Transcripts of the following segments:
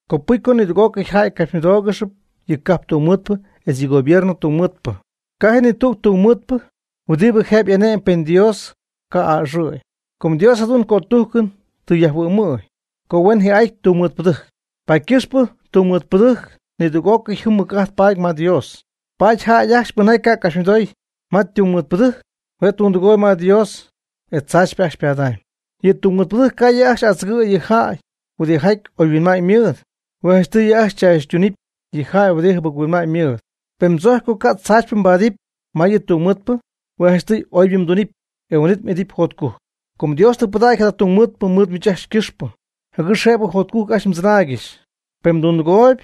Copɨcy co nidüg'ócɨy jäy capxymɨdóogɨxɨpy yɨ cajp tungmɨɨdpɨ etz yɨ gobierno tungmɨɨdpɨ. Ca' ji ni tüg tungmɨɨdpɨ huɨdibɨ jëbɨ y'ane'my pen Dios ca' a'ɨxɨ̈y. Com Dios jadu'n cötujcɨn tɨ yajhuɨ'my co huen jii'aty tungmɨɨdpɨdɨjc, paady ycɨxpɨ tungmɨɨdpɨdɨjc nidüg'ócɨy jɨm mɨc'ajt paady ma Dios. Paady jäy ajcxy pɨnjaty ca' ycapxymɨdoy ma tungmɨɨdpɨdɨjc, hue' tundɨgooyb ma Dios e tzaachypɨ ajcxy ypadaamyb. Yɨ mɨjtungmɨɨdpɨ ca' yɨ' ajcxy adzɨgɨ̈y yɨ jäy huɨdijaty oyhuinma'ñ mɨɨd. Hue' janchtɨy yɨ' ajcxy chaachytunɨpy yɨ jäy huɨdi jɨbɨc-huinma'ñ mɨɨd. Pen mdzojcyp co ca' tzaachypɨ mbaadɨpy ma yɨ tungmɨɨdpɨ, hue' janchtɨy oybɨ mdunɨpy, e huin'it m'idɨpy jotcujc. Com Dios tɨ pɨdägy jada tungmɨɨdpɨ mɨɨd miich ajcxy ycɨxpɨ, jɨgɨx jëbɨ jotcujc ajcxy mdzɨnaaygɨxy. Pen mdundɨgooyb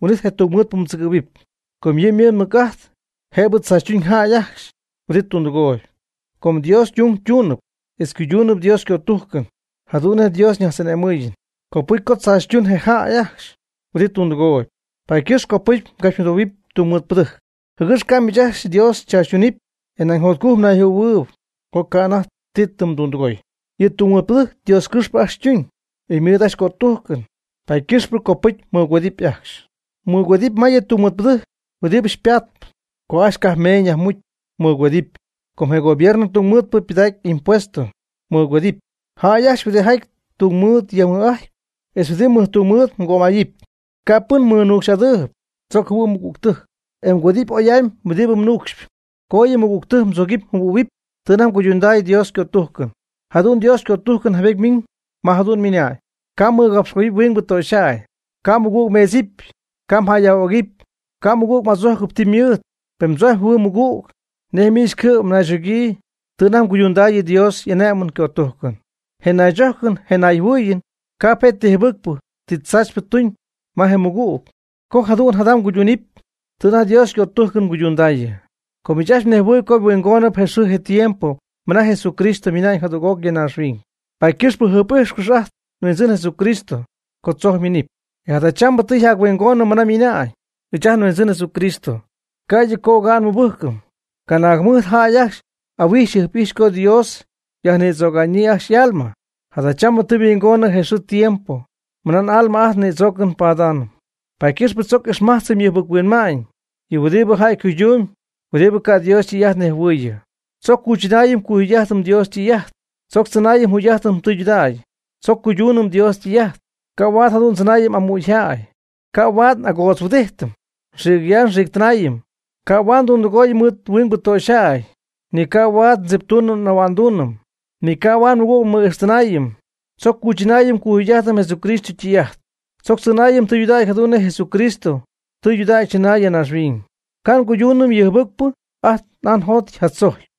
huin'it je tungmɨɨdpɨ mdzɨgɨ̈huɨpy, com yɨ' ymɨɨd mɨc'ajt jëbɨ tzaachytuñ jäy ajcxy huɨdibɨ tundɨgooyb. Com Dios ytung ytuunɨpy etz ycuyduunɨpy Dios ycötujcɨn jadu'n nej Dios xyñajtz'ane'mɨɨyɨm, copɨcy co tzaachytuñ je jäy ajcxy huɨdibɨ tundɨgooyb. Paady ycɨxp copɨcy mgapxymɨdohuɨpy tungmɨɨdpɨdɨjc, jɨgɨx ca' miich ajcxy Dios xychaachytunɨpy e nañ jotcujc mnayjɨhuɨ̈huɨɨyb co ca' anajty ti tɨ mdundɨgoy. Yɨ tungmɨɨdpɨdɨjc Dios ycɨxpɨ ajcxy ytuñ, e ymɨɨd ajcxy ycötujcɨn, paady ycɨxpɨ copɨcy mmɨgüedɨpy ajcxy. Mgüedɨpy ma yɨ tungmɨɨdpɨdɨjc huɨdibɨ xypaatp. Co ajcxy cajp meeñ yajmucy, mɨgüedɨpy. Co je gobierno tungmɨɨdpɨ pɨdägy impuestos, mɨgüedɨpy. Jäy ajcxy huɨdijaty tungmɨɨd myajmɨj'adɨpy, etz huɨdi mɨjtungmɨɨd mgömayɨpy. Ca' pɨn mɨnuucxy'adɨɨyb. Tzoc jɨhuɨ' mmɨgügtɨjc, e mgüedɨpy oy'amy huɨdibɨ mnuucxyp. Co yɨ mmɨgügtɨjc mdzogɨpy mjɨhuɨ̈huɨpy tɨ anajty mguydundäy Dios ycötujcɨn. Jadu'n Dios ycötujcɨn jaybety ymiiñ, ma jadu'n ymɨna'ñ: “Ca' mmɨgapxtɨgoyɨpy huingbɨ töxyjäy. Ca' mmɨgüg mmeedzɨpy. Ca' mjäyyaj'ögɨpy. Ca' mmɨgüg m'adzojcɨpy ti ymɨɨd.” Pen mdzojcpy mjɨhuɨɨyb mɨgüg nej miich cɨ'm mnaychogyii tɨ anajty mguydundaayɨ Dios y'ane'mɨn ycötujcɨn. Je naychojcɨn je nayjɨhuɨɨyɨn ca'p je' ti jɨbɨcpɨ ti tzaachypɨ tuñ ma je mɨgüg, co jadu'n jada mguydundähuɨpy tɨ anajty Dios ycötujcɨn mguydundaayɨ. Com miich ajcxy mnejhuɨɨyb co huingon je xɨɨ je tiempo mɨna Jesucristo mina'ñ jadüg'oc ya naaxhuiñ, paady ycɨxpɨ jɨjp'ijxcɨx ajt nHuindzɨn Jesucristo co tzojc yminɨpy. E jadachambɨ tɨ yjac-huingonɨ mɨna miina'ñ ɨɨch ajt nHuindzɨn Jesucristo, ca'ydɨ co oga'n nmɨbɨjcɨm. Canaag jɨmɨjt jäy ajcxy ahuijxy jɨjp'ijxpy co Dios yajnïdzöga'ñyii ajcxy y'alma, jadachambɨ tɨ yhuingonɨ je xɨɨ je tiempo mɨna n'alma ajt nïdzoocɨn padaanɨm. Paady ycɨxp tzoc ixmajtzɨm yɨ jɨbɨc-huinma'ñ yɨ huɨdibɨ jäy ycuydumyb huɨdibɨ ca' Dios ytɨy'ajt nejhuɨɨyɨ. Tzoc cuychɨnaayɨm cuyjugy'ajtɨm Dios ytɨy'ajt. Tzoc tzɨnaayɨm jugy'ajtɨm tudägy. Tzoc cuyduunɨm Dios ytɨy'ajt. Ca' huaad jadu'n ndzɨnaayɨm amügyjäy. Ca' huaad n'agootzhuɨdijtɨm xiicyaax xiictɨnaayɨm. Ca' huaad ndundɨgooyɨm mɨɨd huingbɨ töxyjäy. Ni ca' huaad ndziptuunɨm ahua'nduunɨm. Ni ca' huaad nmɨgüg nmɨ'ijxtɨnaayɨm. Tzoc cuychɨnaayɨm cuyjugy'ajtɨm Jesucristo ytɨy'ajt. Tzoc tzɨnaayɨm tɨydudägy jadu'n nej Jesucristo tɨydudägy tɨ chɨnäy ya naaxhuiñ. Ca' nguyduunɨm ti jɨbɨcpɨ ajt n'aa njot yja'adzojcpy.